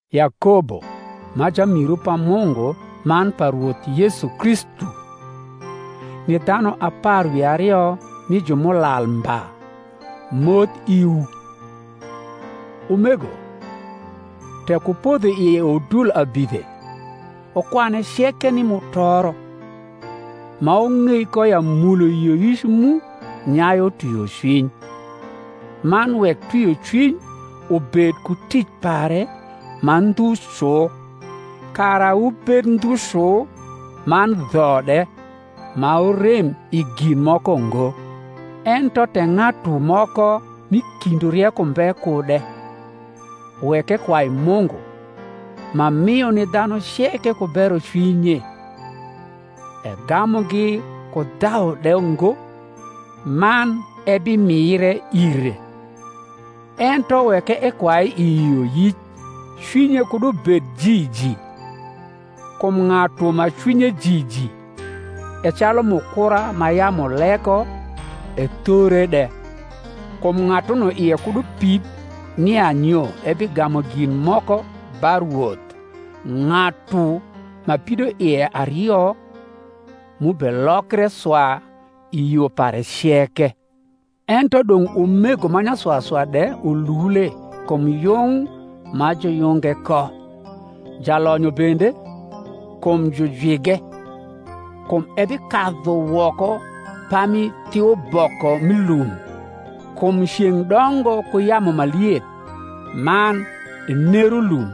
Yakobo, ma jamiru pa Mungu man pa Rwoth Yesu Kristu, ni dhanu apar wi ario mi Jumulal mba, moth iwu. Umego, tek wupodho i udul abidhe, wukwane ceke ni mutoro; ma wung’ei ko ya mulo yioyic mu nyayu twiocwiny. Man wek twiocwiny ubed ku tic pare ma ndhu cu, kara wubed ndhu cu man dho de, ma wurem i gin moko ngo. Ento tek ng’atu moko m’i kindwu rieko mbe kude, wek ekwai Mungu, ma mio ni dhanu ceke ku berocwinye, egamugi ku dhau de ngo; man ebimire ire. Ento wek ekwai i yioyic, cwinye kud ubed jiji: kum ng’atu ma cwinye jiji e calu mukura ma yamu leko ethore de. Kum ng’atuno ie kud upid nia nyo ebigamu gin moko ba Rwoth; ng’atu ma pidoie ario, m’ubelokre swa i yo pare ceke. Ento dong’ umego ma nyaswaswa de ulule kum yung ma juyunge ko: jalonyo bende, kum jujwige: kum ebikadhu woko pami thiuboko m’i lum. Kum ceng’ dongo ku yamu ma lieth, man enero lum: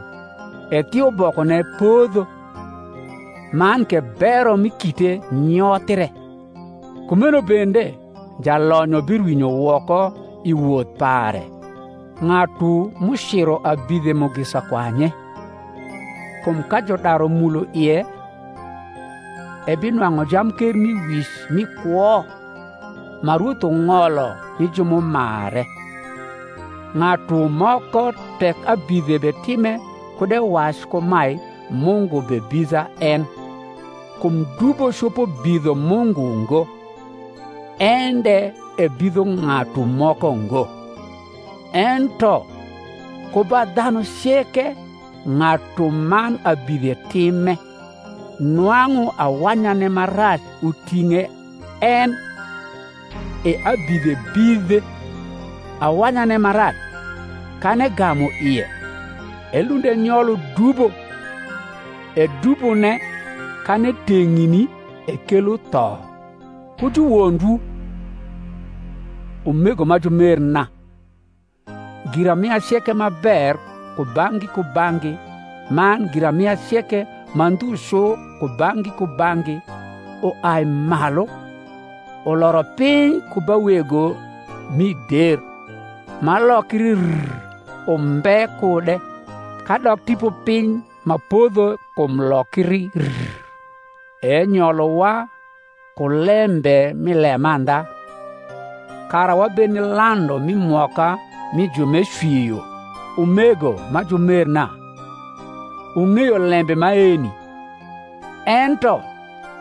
e thiubokone podho, man ke bero mi kite nyothre: kumeno bende jalonyo birwinyo woko i woth pare. Ng’atu m’uciro abidhe mugisa kwanye; kum ka judaru mulo ie, ebinwang’u jamkermiwic mi kwo, ma Rwoth ung’olo ni ju m’umare. Ng’atu moko tek abidhe betime kud ewac kumae, Mungu bebidha en; kum dubo copo bidho Mungu ngo, en de ebidho ng’atu moko ngo: ento ku ba dhanu ceke ng’atuman abidhe time, nwang’u awanyane ma rac uting’e en, e abidhe bidhe. Awanyane ma rac, kan egamu ie, elund enyolo dubo: e dubone, kan eteng’ni, ekelo tho. Ku juwondwu, umego ma jumerna. Giramia ceke ma ber kubang’gi kubang’gi man giramia ceke ma ndhu cu kubang’gi kubang’gi, uai malu, uloro piny ku ba Wego mi der, ma lokri rr umbe kude, kadok tipopiny ma podho kum lokri rr. E enyolowa ku lembe mi lemandha, kara wabed ni landu mi mwoka mi ju m’ecwio. Umego ma jumerna, wung’eyo lembe maeni. Ento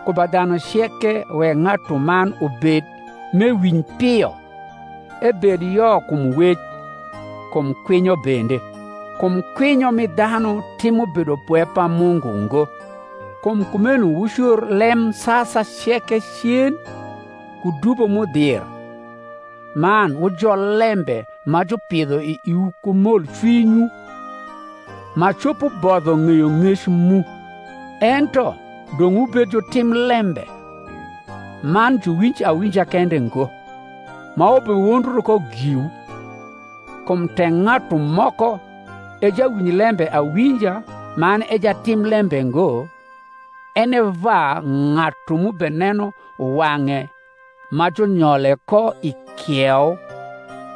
ku ba dhanu ceke wek ng’atuman ubed m’ewinj pio, ebed yo kum wec, kum kwinyo bende; kum kwinyo mi dhanu timo bedopwe pa Mungu ngo. Kum kumeno wucor lemsasa ceke cen ku dubo m’udhir, man wujol lembe ma jupidho i iwu ku molcwinywu, ma copo bodho ng’eyong’ec mu. Ento dong’ wubed jutim lembe, man juwinj awinja kende ngo, ma wubewondru ko giwu. Kum tek ng’atu moko e jawinj lembe awinja man e jatim lembe ngo, en e va ng’atu m’ubeneno wang’e ma junyole ko i kieu: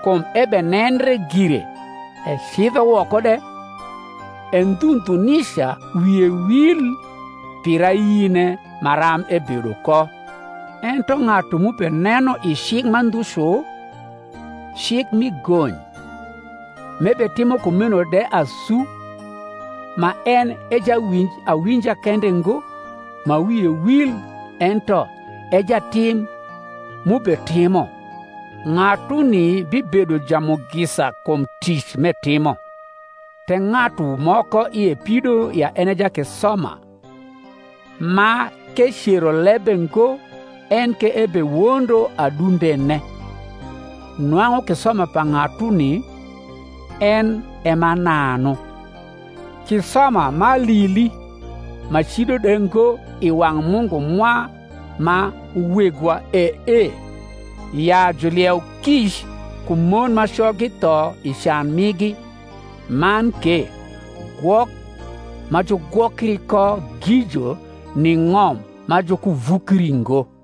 kum ebenendre gire, ecidho woko de, e ndhu ndhu nica wie wil pir ayine maram ebedo ko. Ento ng’atu m’ubeneno i cik ma ndhu cu, cik mi gony, m’ebetimo kumeno de asu, ma en e jawinj awinja kende ngo ma wie wil ento e jatim m’ubetimo, ng’atuni bibedo jamugisa kum tic m’etimo. Tek ng’atu moko ie pido ya en e jakisoma, ma k’ecero lebe ngo enke ebewondo adundene, nwang’u kisoma pa ng’atuni en e mananu. Kisoma m’alili ma cido de ngo i wang’ Mungu mwa ma Wegwa e ee, ya julieu kic ku mon ma coggi tho i can migi, man ke gwok ma jugwokri ko gijo ni ng’om ma jukuvukri ngo.